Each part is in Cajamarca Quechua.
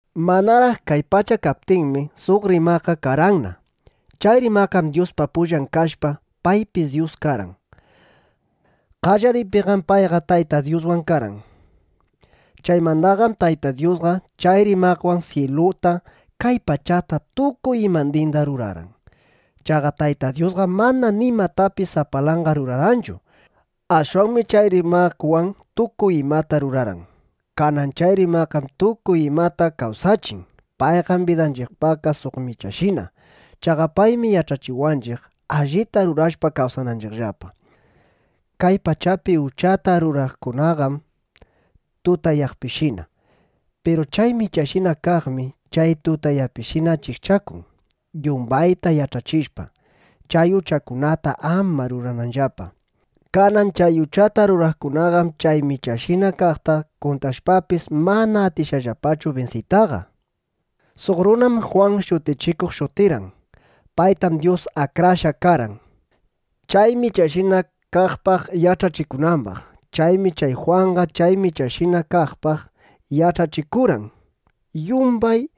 Manaraq kay pacha kaptinmi, suq Rimaqqa karqanna. Chay Rimaqqam Dyuspa pullan kashpa, paypis Dyus karqan. Qallariypiqam payqa Tayta Dyuswan karqan. Chaymandaqam Tayta Dyusqa chay Rimaqwan syiluta, kay pachata, tukuy imandinda rurarqan. Chaqa Tayta Dyusqam mana nimatapis sapalanqa rurarqanchu. Ashwanmi chay Rimaqwan tukuy imataqa rurarqan. Kanan chay Rimaqqam tukuy imata kawsachin. Payqam bidanchiqpaqqa suq Michashina. Chaqa paymi yach'achiwanchiq, allita rurashpa kawsananchiqllapa. Kay pachapi uchata ruraqkunaqam tutayaqpishina. Piru chay Michashina kaqmi chay tutayaqpishina achikchakun, yumbayta yach'achishpa, chay uchakunata ama rurananllapa. Kanan chay uchata ruraqkunaqam chay Michashina kaqta kuntrashpapis, mana atishqallapachu binsiytaqa. Suq runam Jwan Shutichikuq shutirqan. Paytam Dyus akrashqa karqan, chay Michashina kaqpaq yach'achikunambaq. Chaymi chay Jwanqa chay Michashina kaqpaq yach'achikurqan, yumbay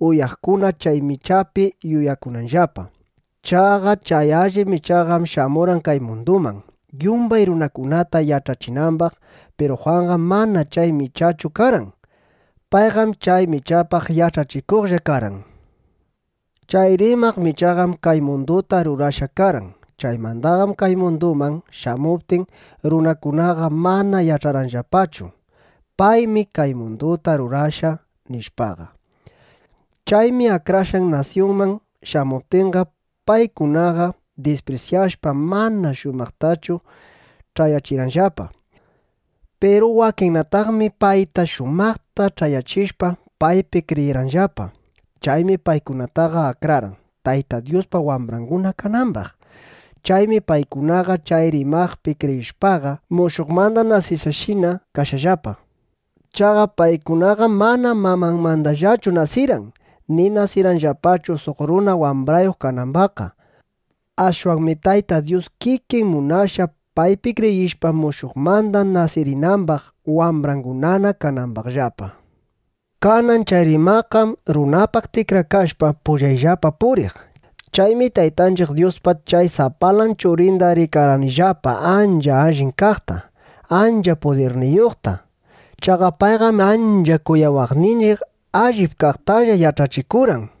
uyaqkuna chay Michapi yuyakunanllapa. Chaqa chay allip Michaqam shamurqan kay munduman, yumbay runakunata yach'achinambaq. Piru Jwanqam mana chay Michachu karqan. Payqam chay Michapaq yach'achikuqlla karqan. Chay Rimaq Michaqam kay munduta rurashqa karqan. Chaymandaqam kay munduman shamuptin, runakunaqa mana yach'arqanllapachu: Paymi kay munduta rurashqa, nishpaqa. Chaymi akrashqan nasyunman shamuptinqa, paykunaqa disprisyashpa, mana shumaqtachu ch'ayachirqanllapa. Piru wakinnataqmi payta shumaqta ch'ayachishpa, paypi kriyirqanllapa. Chaymi paykunataqa akrarqan, Tayta Dyuspa wambranguna kanambaq. Chaymi paykunaqa chay Rimaqpi kriyishpaqa, mushuqmanda nasishqashina kashqallapa. Chaqa paykunaqam mana mamanmandallachu nasirqan, ni nasirqanllapachu suq runa wambrayuq kanambaqqa. Ashwanmi Tayta Dyus kikin munashqa, paypi kriyishpa, mushuqmanda nasirinambaq, wambrangunana kanambaqllapa. Kanan chay Rimaqqam runapaq tikrakashpa, pullayllapa puriq. Chaymi Taytanchiq Dyuspa chay sapalan Churinda rikarqanillapa ancha allin kaqta, ancha pudirniyuqta. Chaqa payqam ancha kuyawaqninchiq, allip kaqtalla yach'achikurqan.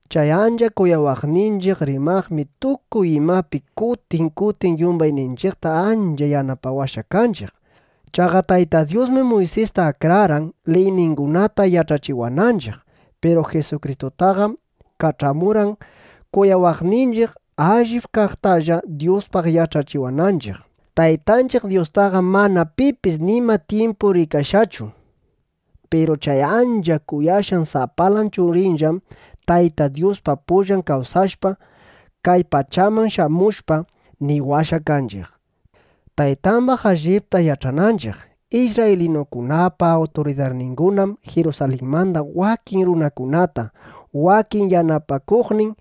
Chay ancha kuyawaqninchiq Rimaqmi tukuy imapi kutin kutin yumbayninchiqta ancha yanapawashqa kanchiq. Chaqa Tayta Dyusmi Muysista akrarqan, liyningunata yach'achiwananchiq. Piru Jisukristutaqam kach'amurqan kuyawaqninchiq, allip kaqtalla Dyuspaq yach'achiwananchiq. Taytanchiq Dyustaqam mana pipis nima tyimpu rikashqachu. Piru chay ancha kuyashqan sapalan Churinllam, Tayta Dyuspa pullan kawsashpa, kay pachaman shamushpa, niwashqa kanchiq, Taytambaq allipta yach'ananchiq. Isrraylinukunapa awturidarningunam Jirusalinmanda wakin kurakunata, wakin yanapakuqnin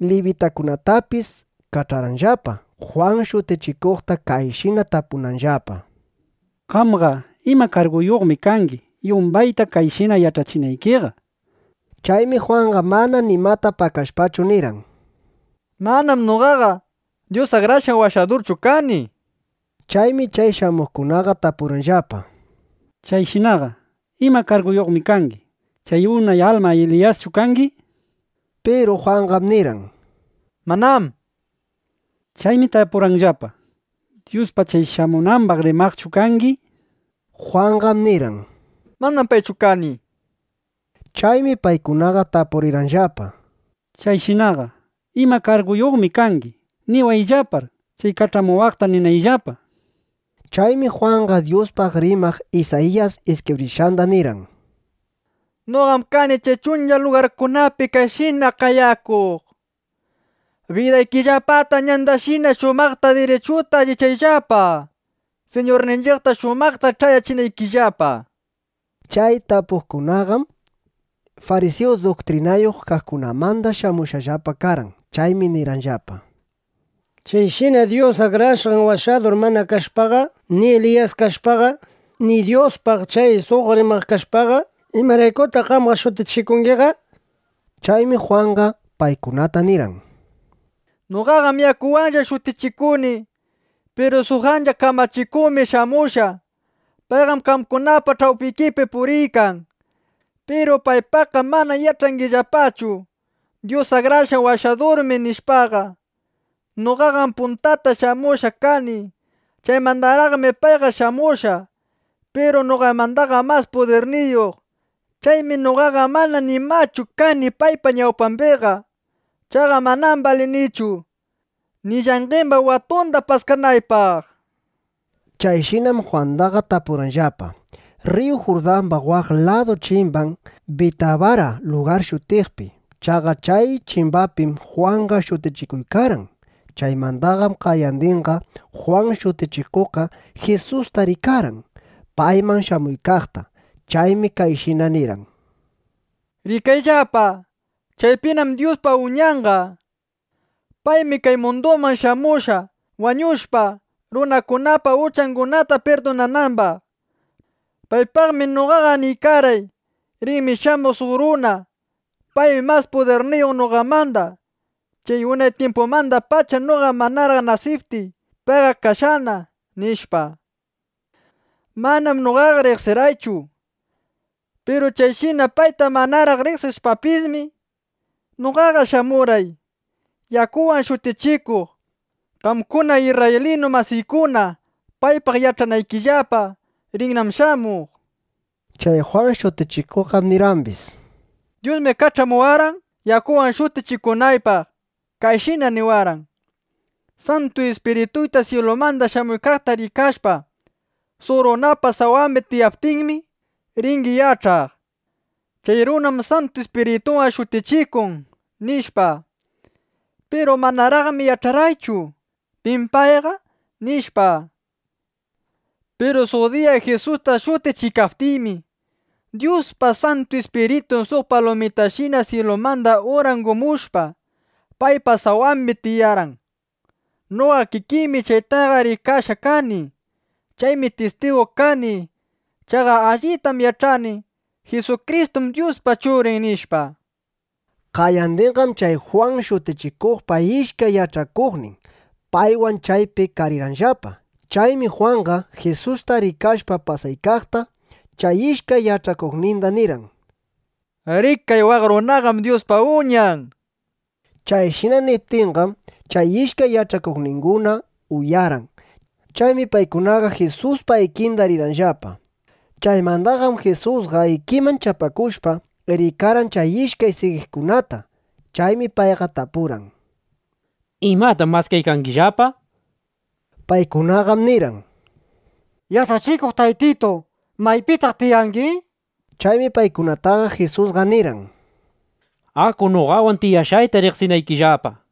libitakunatapis kach'arqanllapa, Jwan Shutichikuqta kayshina tapunanllapa: —Qamqa, ¿ima karguyuqmi kangi, yumbayta kayshina yach'achinaykiqa? nishpa. Chaymi Jwanqa mana nimata pakashpachu, nirqan: —Manam noqaqa Dyus Akrashqan Washadurchu kani, nishpa. Chaymi chay shamuqkunaqa tapurqanllapa: —Chayshinaqa ¿ima karguyuqmi kangi? ¿Chay unay alma Eliyaschu kangi? nishpa. Piru Jwanqam nirqan: —Manam, nishpa. Chaymi tapurirqanllapa: —¿Dyuspaq chay shamunambaq rimaqchu kangi? nishpa. Jwanqam nirqan: —Manam paychu kani, nishpa. Chaymi paykunaqa tapurirqanllapa: —Chayshinaqa ¿ima karguyuqmi kangi? Niwayllapar, chay kach'amuwaqta ninaypaq, nishpa. Chaymi Jwanqa Dyuspaq rimaq Isayiyas iskibrishqanda nirqan: —Noqam kani chay chuncha lugarkunapi kayshina qayakuq: “Bidaykillapata ñandashina shumaqta dirichuta allichayllapa, Siñurninchiqta shumaqta ch'ayachinaykillapa”, nishpa. Chay tapuqkunaqam farisiyu duktrinayuq kaqkunamanda shamushqallapa karqan. Chaymi nirqanllapa: —Chayshina Dyus Akrashqan Washadur mana kashpaqa, ni Eliyas kashpaqa, ni Dyuspaq chay suq rimaq kashpaqa, ¿imaraykutaq qamqa shutichikungiqa? nishpa. Chaymi Jwanqa paykunata nirqan: —Noqaqam yakuwanlla shutichikuni. Piru suq ancha kamachikuqmi shamushqa. Payqam qamkunapa ch'awpikipi puriykan. Piru paypaqqam mana yach'angillapachu: Dyus Akrashqan Washadurmi, nishpaqa. Noqaqam puntata shamushqa kani. Chaymandaraqmi payqa shamushqa. Piru noqamandaqam mas pudirniyuq. Chaymi noqaqa mana nimachu kani paypa ñawpambiqa. Chaqa manam balinichu, ni llanqemba watunda paskanaypaq, nishpa. Chayshinam Jwandaqa tapurqanllapa, rriyu Jurdamba waq ladu chimban Bitabara lugar shutiqpi. Chaqa chay chimbapim Jwanqa shutichikuykarqan. Chaymandaqam qayandinqa, Jwan Shutichikuqqa Jisusta rikarqan, payman shamuykaqta. Chaymi kayshina nirqan: —Rikayllapa. Chaypinam Dyuspa Uñanqa. Paymi kay munduman shamushqa, wañushpa, runakunapa uchangunata pirdunanambaq. Paypaqmi noqaqa niykarqay: “Rinmi shamuq suq runa. Paymi mas pudirniyuq noqamandaqa. Chaqa unay tyimpumandapacham noqa manaraq nasiptiy, payqa kashqana”, nishpa. Manam noqaqa riqsirqaychu. Piru chayshina payta manaraq riqsishpapismi, noqaqa shamurqay, yakuwan shutichikuq, qamkuna isrraylinu masiykuna paypaq yach'anaykillapa: Rinnam shamuq, nishpa. Chay Jwan Shutichikuqqam nirqambis: —Dyusmi kach'amuwashpa, yakuwan shutichikunaypaq, kayshina niwarqan: “Santu Ispirituyta syilumanda shamuykaqta rikashpa, suq runapa sawambi tiyaptinmi, ringi yach'aq: Chay runam Santu Ispirituwan shutichikun”, nishpa. Piru manaraqmi yach'arqaychu: ¿Pim payqa? nishpa. Piru suq diya Jisusta shutichiykaptiymi, Dyuspa Santu Ispiritun suq palumitashina syilumanda urangumushpa, paypa sawambi tiyarqan. Noqa kikiymi chaytaqa rikashqa kani. Chaymi tistigu kani. Chaqa allitam yach'ani: Jisukristum Dyuspa Churin, nishpa. Qayandinqam chay Jwan Shutichikuqpa ishkay yach'akuqnin paywan chaypi karirqanllapa. Chaymi Jwanqa, Jisusta rikashpa pasaykaqta, chay ishkay yach'akuqninda nirqan: —Rikay, waq runaqam Dyuspa Uñan, nishpa. Chayshina niptinqam, chay ishkay yach'akuqninguna uyarqan. Chaymi paykunaqa Jisuspa ikinda rirqanllapa. Chaymandaqam Jisusqa ikiman chapakushpa, rikarqan chay ishkay sigiqkunata. Chaymi payqa tapurqan: —¿Imatam maskaykangillapa? nishpa. Paykunaqam nirqan: —Yach'achikuq Taytitu, ¿maypitaq tiyangi? nishpa. Chaymi paykunataqa Jisusqa nirqan: —Aku noqawan, tiyashqayta riqsinaykillapa, nishpa.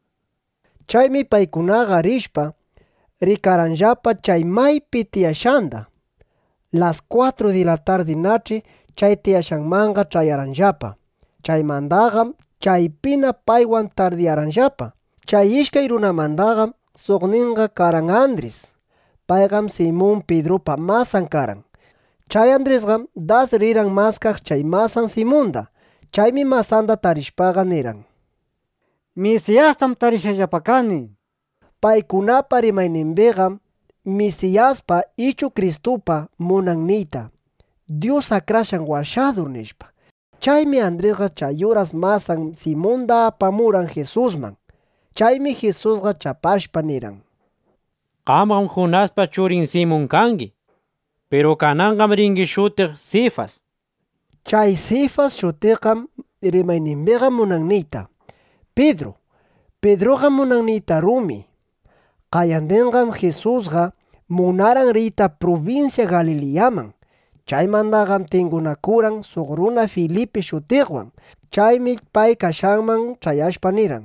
Chaymi paykunaqa rishpa, rikarqanllapa chay maypi tiyashqanda. Las kwatru di la tardinach'i chay tiyashqanmanqa ch'ayarqanllapa. Chaymandaqam chaypina paywan tardiyarqanllapa. Chay ishkay runamandaqam suqninqa karqan Andris. Payqam Simun Pidrupa masan karqan. Chay Andrisqam das rirqan maskaq chay masan Simunda. Chaymi masanda tarishpaqa, nirqan: —Misiyastam tarishqallapa kani, nishpa. (Paykunapa rimaynimbiqam “Misiyasqa” ichu “Kristuqa” munan niyta “Dyus Akrashqan Washadur”, nishpa.) Chaymi Andrisqa chay uras masan Simunda apamurqan Jisusman. Chaymi Jisusqa chapashpa, nirqan: —Qamqam Junaspa churin Simun kangi. Piru kananqam ringi shutiq Sifas, nishpa. Chay Sifas shutiqqam rimaynimbiqa munan niyta “Pidru”. (Pidruqam munan niyta “rumi”.) Qayandinqam Jisusqa munarqan riyta prubinsya Galiliyaman. Chaymandaqam tingunakurqan suq runa Filipi shutiqwan. Chaymi pay kashqanman ch'ayashpa nirqan: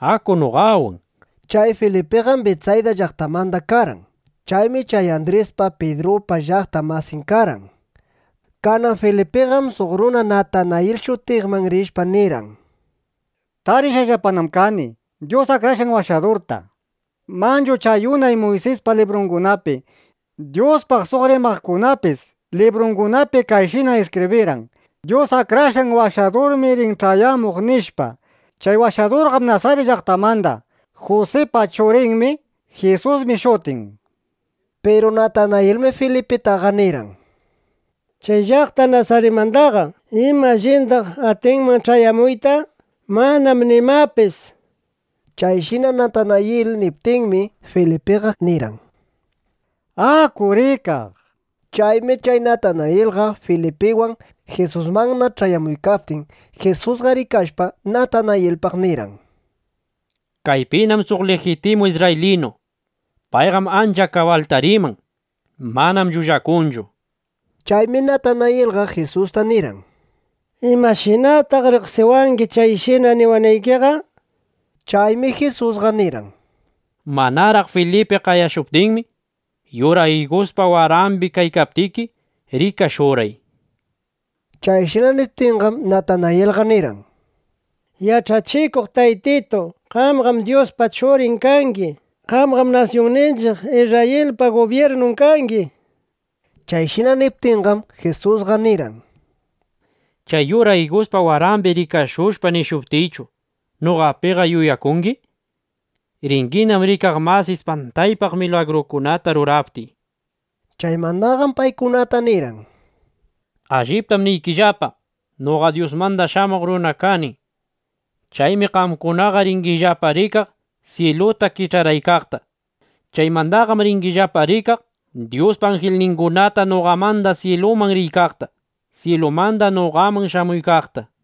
—Aku noqawan, nishpa. Chay Filipiqam Bitsayda llaqtamanda karqan. Chaymi chay Andrispa, Pidrupa llaqta masin karqan. Kanan Filipiqam suq runa Natanayil shutiqman rishpa nirqan: —Tarishqallapanam kani Dyus Akrashqan Washadurta. Manchu chay unay Muysis librungunapi, Dyuspaq suq rimaqkunapis librungunapi kayshina iskibrirqan: “Dyus Akrashqan Washadurmi rin ch'ayamuq”, nishpa. Chay Washadurqam Nasarit llaqtamanda. Jusipa churinmi. Jisusmi shutin, nishpa. Piru Natanayilmi Filipitaqa nirqan: —¿Chay llaqta Nasaritmandaqa ima allindaq atinman ch'ayamuyta? Manam nimapis, nishpa. Chayshina Natanayil niptinmi, Filipiqa nirqan: —Aku rikaq, nishpa. Chaymi chay Natanayilqa Filipiwan Jisusmanna ch'ayamuykaptin, Jisusqa rikashpa, Natanayilpaq nirqan: —Kaypinám suq lijitimu isrraylinu. Payqam ancha kabalta riman. Manam llullakunchu, nishpa. Chaymi Natanayilqa Jisusta nirqan: —¿Imashinataq riqsiwangi, chayshina niwanaykiqa? nishpa. Chaymi Jisusqa nirqan: —Manaraq Filipi qayashuptinmi, yura iguspa warambi kaykaptiki, rikashurqay, nishpa. Chayshina niptinqam, Natanayilqa nirqan: —Yach'achikuq Taytitu, qamqam Dyuspa Churin kangi. Qamqam nasyunninchiq Isrrayilpa gubyirnun kangi, nishpa. Chayshina niptinqam, Jisusqa nirqan: —¿Chay yura iguspa warambi rikashushpa nishuptiychu, noqapiqa yuyakungi? Ringinam rikaq mas ispantaypaq milagrukunata ruraptiy, nishpa. Chaymandaqam paykunata nirqan: —Alliptam niykillapa, noqam Dyusmanda Shamuq Runa kani. Chaymi qamkunaqa ringillapa rikaq syiluta kich'araykaqta. Chaymandaqam ringillapa rikaq Dyuspa anjilningunata, noqamanda syiluman riykaqta, syilumanda noqaman shamuykaqta, nishpa.